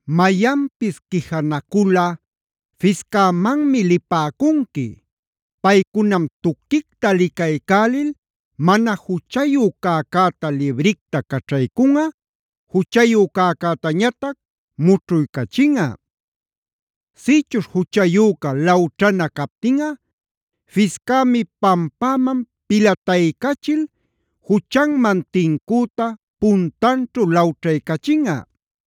“Mayanpis quijanaculꞌa fiscämanmi lipäcunqui. Paycunam tuquicta licaycälil mana juchayu cäcäta libricta caćhaycunꞌa, juchayu cäcätañatac mućhuycachinꞌa. Sïchuśh juchayüca lawćhana captinꞌa fiscämi pampäman pilataycachil juchanman tincüta puntanćhu lawćhaycachinꞌa.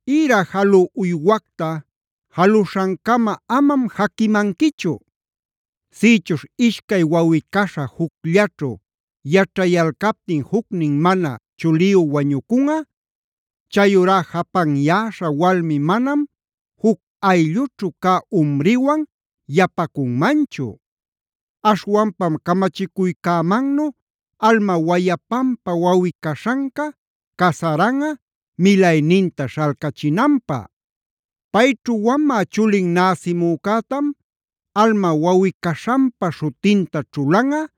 “Ïra jalü uywacta jaluśhancama amam jaquimanquichu.b “Sïchuśh ishcay wawꞌi-caśha jucllaćhu yaćhayalcaptin jucnin mana chuliyu wañucunꞌa; chayurá japanyäśha walmi manam juc ayllućhu cä umriwan yapacunmanchu. Aśhwanpam camachicuycämannu alma wayapanpa wawꞌi-caśhanca casaranꞌa milayninta śhalcachinanpä. Payćhu wamä chulin näsimücätam alma wawꞌi-caśhanpa śhutinta ćhulanꞌa,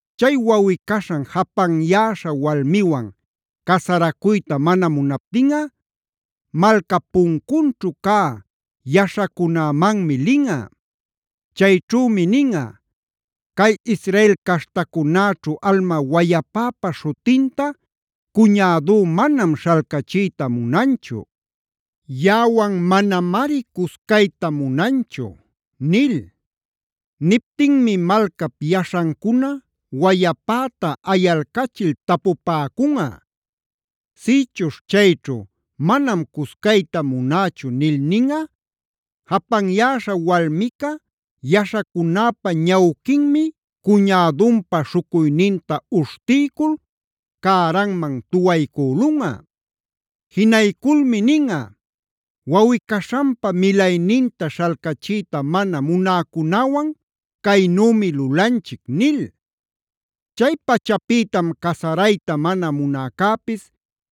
Chay wawꞌi-caśhan japanyäśha walmiwan casaracuyta mana munaptinꞌa malcap puncunćhu cä yaśhacunämanmi linꞌa. Chayćhümi ninꞌa: ‘Cay Israel caśhtacunäćhu alma wayapäpa śhutinta cuñädú manam śhalcachiyta munanchu. Yaꞌawan manamari cuscayta munanchu’ nil. Niptinmi malcap yaśhancuna wayapäta ayalcachil tapupäcunꞌa. Sïchuśh chayćhu: ‘Manam cuscayta munächu’ nil ninꞌa, japanyäśha walmica yaśhacunäpa ñawquinmi cuñädunpa śhucuyninta uśhtiycul, cäranman tuwaycülunꞌa. Jinayculmi ninꞌa: ‘Wawꞌi-caśhanpa milayninta śhalcachiyta mana munäcunäwan caynümi lulanchic’ nil. Chay pachapïtam casarayta mana munäcäpis,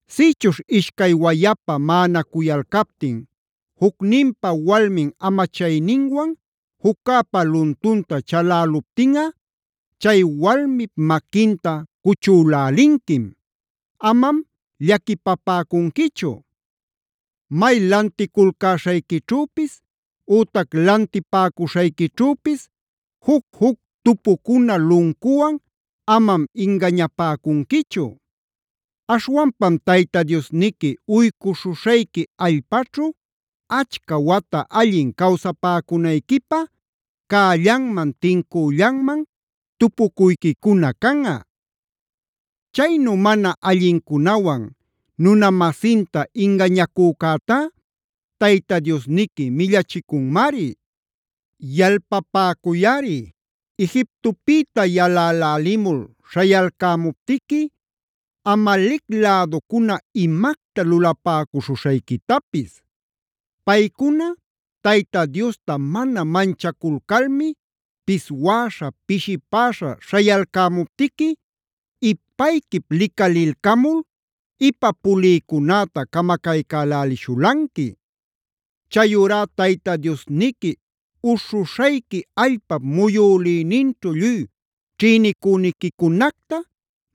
“Sïchuśh ishcay wayapa maꞌanacuyalcaptin jucninpa walmin amachayninwan juccäpä luntunta chaläluptinꞌa, chay walmip maquinta cuchülälinquim. Amam llaquipapäcunquichu. “May lanticulcäśhayquićhüpis ütac lantipäcuśhayquićhüpis juc-juc tupucuna luncuwan amam ingañapäcunquichu. Aśhwanpam Tayta Diosniqui uycuśhuśhayqui allpaćhu achca wata allin cawsapäcunayquipä cällanman tincüllanman tupucuyquicuna canꞌa. Chaynu mana allincunawan nuna-masinta ingañacücätá Tayta Diosniqui millachicunmari.e “Yalpapäcuyꞌari Egiptopïta yalälälimul śhayalcämuptiqui Amalec läducuna imacta lulapäcuśhuśhayquitapis. Paycuna Tayta Diosta mana manchaculcalmi piswäśha, pishipäśha śhayalcämuptiqui ipayquip licalilcamul ipa pulïcunäta camacaycälälishulanqui. Chayurá Tayta Diosniqui uśhuśhayqui allpap muyülïninćhu lluy ćhïnicüniquicunacta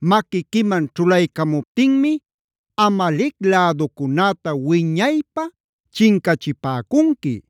maquiquiman ćhulaycamuptinmi Amalec läducunäta wiñaypä chincachipäcunqui.